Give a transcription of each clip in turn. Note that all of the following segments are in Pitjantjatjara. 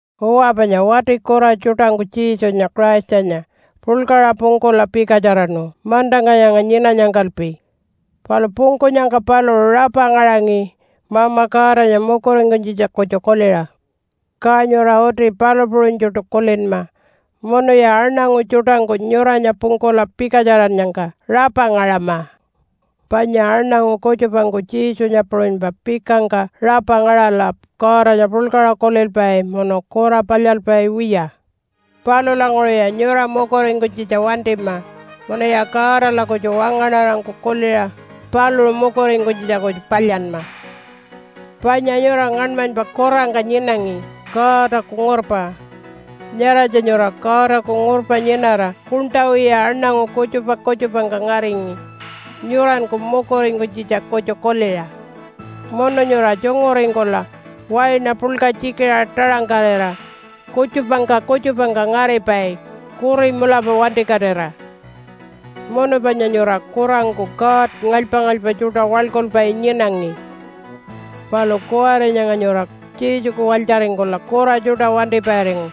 Uwa, panya wati kura tjuṯangku Jesunya Christanya puḻkaṟa pungkula pikatjaraṉu mantangka nyanga nyinanyangkalpi, palu pungkunyangka paluṟu rapa ngaṟangi Mama Godanya mukuringkunytjitja kutju kuliṟa. Ka nyura uti palu puṟunytjuṯu kulinma munuya aṉangu tjuṯangku nyuranya pungkula pikatjarannyangka rapa ngaṟama. Panya aṉangu kutjupangku Jesunya puṟunypa pikangka rapa ngaṟala Godanya puḻkaṟa kulilpai munu kura palyalpai wiya. Palulanguṟuya nyura mukuringkunytjitja wantima munuya Godala kutju wangaṉarangku kuliṟa paluṟu mukuringkunytjitja kutju palyanma. Panya nyura ngaṉmanypa kurangka nyinangi Godaku ngurpa. Nyaratja nyura Godaku ngurpa nyinara kuṉṯa wiya aṉangu kutjupa kutjupangka ngaringi nyuranku mukuringkunytjitja kutju kuliṟa. Munu nyura tjunguringkula waina puḻka tjikiṟa taṟangkarira kutjupangka kutjupangka ngaripai kuri mulapa wantikatira. Munu panya nyura kurangku god ngalypa-ngalypa tjuṯa waḻkulpai nyinangi. Palu kuwari nyanga nyura Jesuku walytjaringkula kura tjuṯa wantipairingu,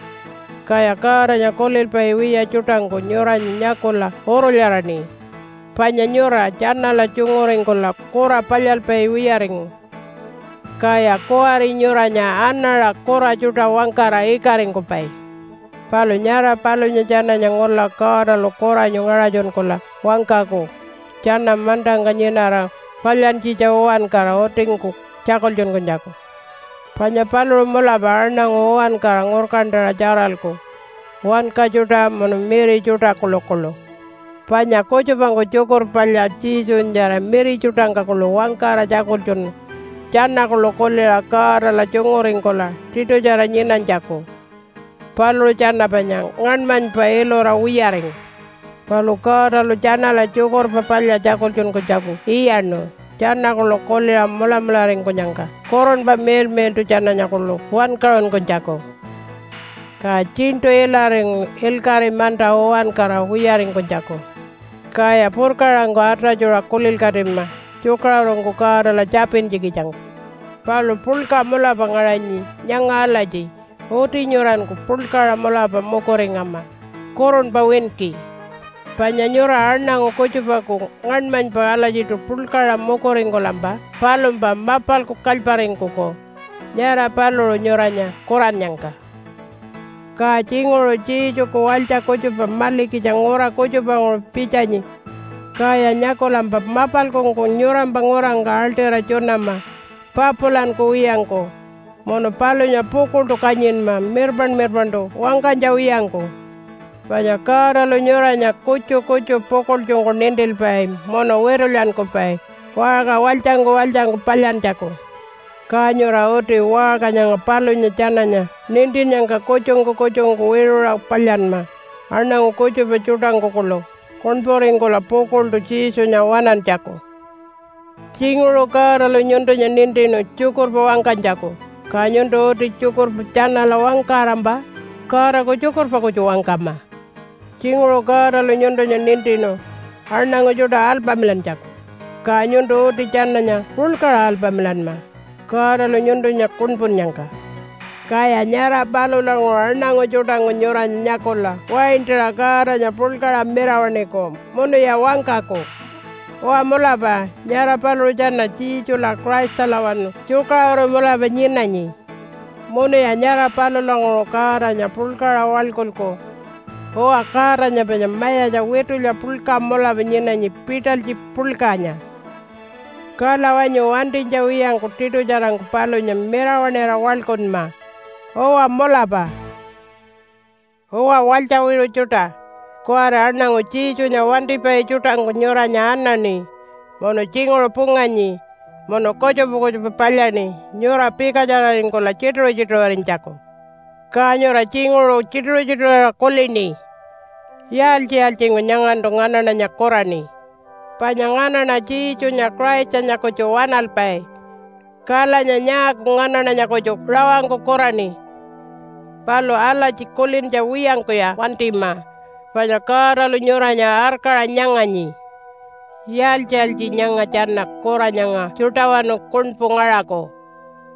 kaya Godanya kulilpai wiya tjuṯangku nyuranya nyakula urulyaraṉi, panya nyura tjanala tjunguringkula kura palyalpai wiyaringu. Kaya kuwari nyuranya anaṟa kura tjuṯa wangkara ikaringkupai. Palu nyara palunya tjananya ngula Godalu kuranyu ngaṟatjunkula wangkaku tjana mantangka nyinara palyantjitja uwankara utingku tjakultjunkunytjaku. Panya paluṟu mulapa aṉangu uwankara ngurkantaṟa tjaralku, wanka tjuṯa munu miri tjuṯa kuḻukuḻu. Panya kutjupangku Tjukurpa Palya Jesunyatjara miri tjuṯangka kuḻu wangkara tjakultjunu tjana kuḻu kuliṟa Godala tjunguringkula tiṯutjara nyinanytjaku. Paluṟu tjana panya ngaṉmanypa ilura wiyaringu. Palu Godalu tjanala Tjukurpa Palya tjakultjunkunytjaku iyaṉu tjana kuḻu kuliṟa mulamularingkunyangka Kurunpa Miḻmiḻṯu tjananya kuḻu wankaṟunkunytjaku. Ka tjiṉṯu ilaringu ilkaṟi manta uwankara wiyaringkunytjaku. Kaya purkaṟangku atatjuṟa kulilkatima tjukaṟurungku Godala tjapintjikitjangku. Palu puḻka mulapa ngaṟanyi nyanga alatji uti nyuranku puḻkaṟa mulapa mukuringama kurunpa winki. Panya nyura aṉangu kutjupaku ngaṉmanypa alatjiṯu puḻkaṟa mukuringkulampa palumpa mapalku kalyparingkuku nyara paluṟu nyuranya kurannyangka. Ka tjinguṟu Jesuku walytja kutjupa malikitja ngura kutjupanguṟu pitjanyi kaya nyakulampa mapalkungku nyurampa ngurangka aḻṯira tjunama papulankuwiyangku, munu palunya pukuḻṯu kanyinma mirpaṉ-mirpaṉṯu wangkanytja wiyangku. Panya Godalu nyuranya kutju kutju pukuḻtjungku nintilpai munu witulyankupai waṟka walytjangku walytjangku palyantjaku. Ka nyura uti waṟka nyanga palunya tjananya nintinnyangka kutjungku kutjungku wiṟuṟa palyanma aṉangu kutjupa tjuṯangku kuḻu kuṉpuringkula pukuḻṯu Jesunya waṉantjaku. Tjinguṟu Godalu nyuntunya nintinu tjukurpa wangkanytjaku, ka nyuntu uti tjukurpa tjanala wangkarampa Godaku tjukurpa kutju wangkama. Tjinguṟu Godalu nyuntunya nintinu aṉangu tjuṯa alpamilantjaku, ka nyuntu uti tjananya puḻkaṟa alpamilanma, Godalu nyuntunya kuṉpunnyangka. Kaya nyara palulanguṟu aṉangu tjuṯangku nyuranya nyakula waintaṟa Godanya puḻkaṟa mirawaṉiku munuya wangkaku, “Uwa, mulapa nyara paluṟu tjana Jesula Christalawanu tjukaṟuru mulapa nyinanyi.” Munuya nyara palulanguṟu Godanya puḻkaṟa waḻkulku. Uwa, Godanya panya mayatja witulya puḻka mulapa nyinanyi pitalytji puḻkanya. Kala wanyu wantinytja wiyangku tiṯutjarangku palunya mirawaṉira waḻkunma. Uwa, mulapa. Uwa walytja wiṟu tjuṯa, kuwari aṉangu Jesunya wantipai tjuṯangku nyuranya anaṉi munu tjinguṟu punganyi munu kutjupa kutjupa palyaṉi nyura pikatjararingkula tjituṟu-tjituṟurinytjaku. Ka nyura tjinguṟu tjituṟu-tjituṟurira kulini, “Yaaltji-yaaltjingku nyangantu nganaṉanya kuraṉi? Panya nganaṉa Jesunya Christanya kutju waṉalpai. Kalanya nyaaku nganaṉanya kutju rawangku kuraṉi?” Palu alatji kulintja wiyangkuya wantima panya Godalu nyuranya arkaṟa nyanganyi, “Yaaltji-yaaltji nyanga tjana kura nyanga tjuṯawanu kuṉpu ngaṟaku?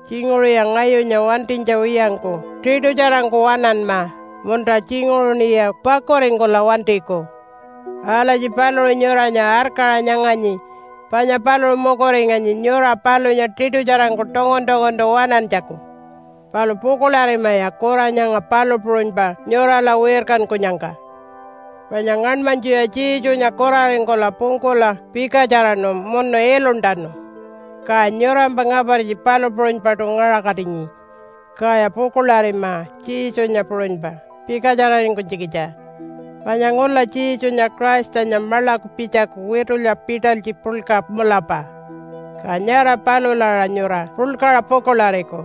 Tjinguṟuya ngayunya wantinytja wiyangku tiṯutjarangku waṉanma, munta tjinguṟuṉiya pakuringkula wantiku.” Alatji paluṟu nyuranya arkaṟa nyanganyi panya paluṟu mukuringanyi nyura palunya tiṯutjarangku tungun-tunguntu waṉantjaku. Palu pukuḻarimaya kura nyanga palu puṟunypa nyurala wirkankunyangka. Panya ngaṉmanytjuya Jesunya kuraringkula pungkula pikatjaraṉu munu iluntanu. Ka nyurampa ngapartji palu puṟunypaṯu ngaṟakatinyi. Kaya pukuḻarima Jesunya puṟunypa pikatjararingkunytjikitja. Panya ngula Jesunya Christanya maḻaku pitjaku witulya pitalytji puḻka mulapa, ka nyara palula aṟa nyura puḻkaṟa pukuḻariku.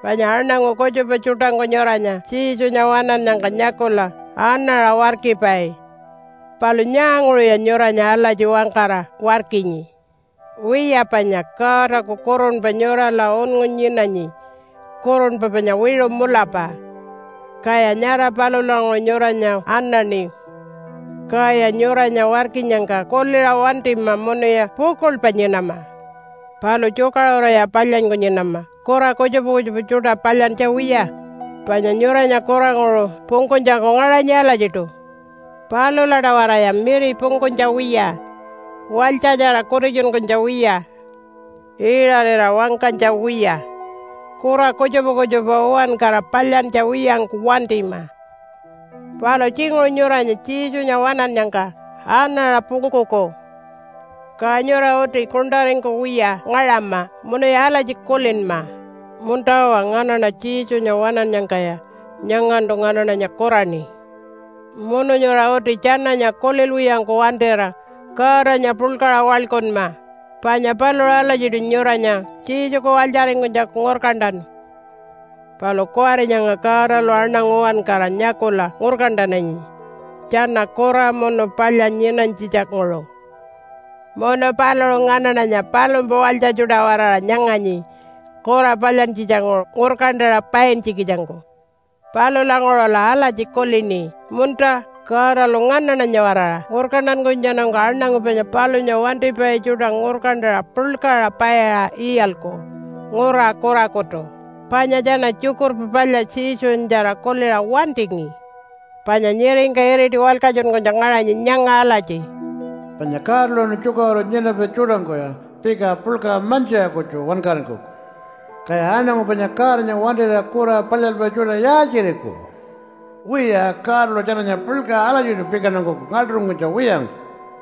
Panya aṉangu kutjupa tjuṯangku nyuranya Jesunya waṉannyangka nyakula anaṟa warkipai. Palu nyaanguṟuya nyuranya alatji wangkara warkinyi? Wiya, panya Godaku kurunpa nyurala unngu nyinanyi kurunpa panya wiṟu mulapa, kaya nyara palulanguṟu nyuranya anaṉi. Kaya nyuranya warkinyangka kuliṟa wantima munuya pukuḻpa nyinama. Palu tjukaṟuruya palyanyku nyinama kura kutjupa kutjupa tjuṯa palyantja wiya. Panya nyuranya kuranguṟu pungkunytjaku ngaṟanyi alatjiṯu. Palula-tawaraya miri pungkunytja wiya, walytjatjara kutitjunkunytja wiya, iṟarira wangkanytja wiya, kura kutjupa kutjupa uwankara palyantja wiyangku wantima. Palu tjinguṟu nyuranya Jesunya waṉannyangka anaṟa pungkuku, ka nyura uti kuṉṯaringkuwiya ngaṟama munuya alatji kulinma, “Munta-uwa, nganaṉa Jesunya waṉannyangkaya nyangantu nganaṉanya kuraṉi.” Munu nyura uti tjananya kulilwiyangku wantira Godanya puḻkaṟa waḻkunma, panya paluṟu alatjiṯu nyuranya Jesuku walytjaringkunytjaku ngurkantanu. Palu kuwari nyanga Godalu aṉangu uwankara nyakula ngurkantananyi tjana kura munu palya nyinanytjitja-nguṟu. Munu paluṟu nganaṉanya palumpa walytja tjuṯa-waraṟa nyanganyi kura palyantjitja-nguṟu ngurkantaṟa paintjikitjangku. Palulanguṟula alatji kulini, “Munta, Godalu nganaṉanya-waraṟa ngurkantankunytjatjanungku aṉangu panya palunya wantipai tjuṯa ngurkantaṟa puḻkaṟa paiṟa iyalku ngura kurakutu, panya tjana Tjukurpa Palya Jesunyatjara kuliṟa wantingi.” Panya nyiringka iriti walkatjunkunytja ngaṟanyi nyanga alatji, “Panya Godalawanu tjukaṟuru nyinapai tjuṯangkuya pika puḻka mantjiṟa kutju wankaringkuku. Kaya aṉangu panya Godanya wantira kura palyalpai tjuṯa yaaltjiriku? Wiya, Godalu tjananya puḻkaṟa alatjiṯu pikantankuku ngaḻṯuringkunytja wiyangku.”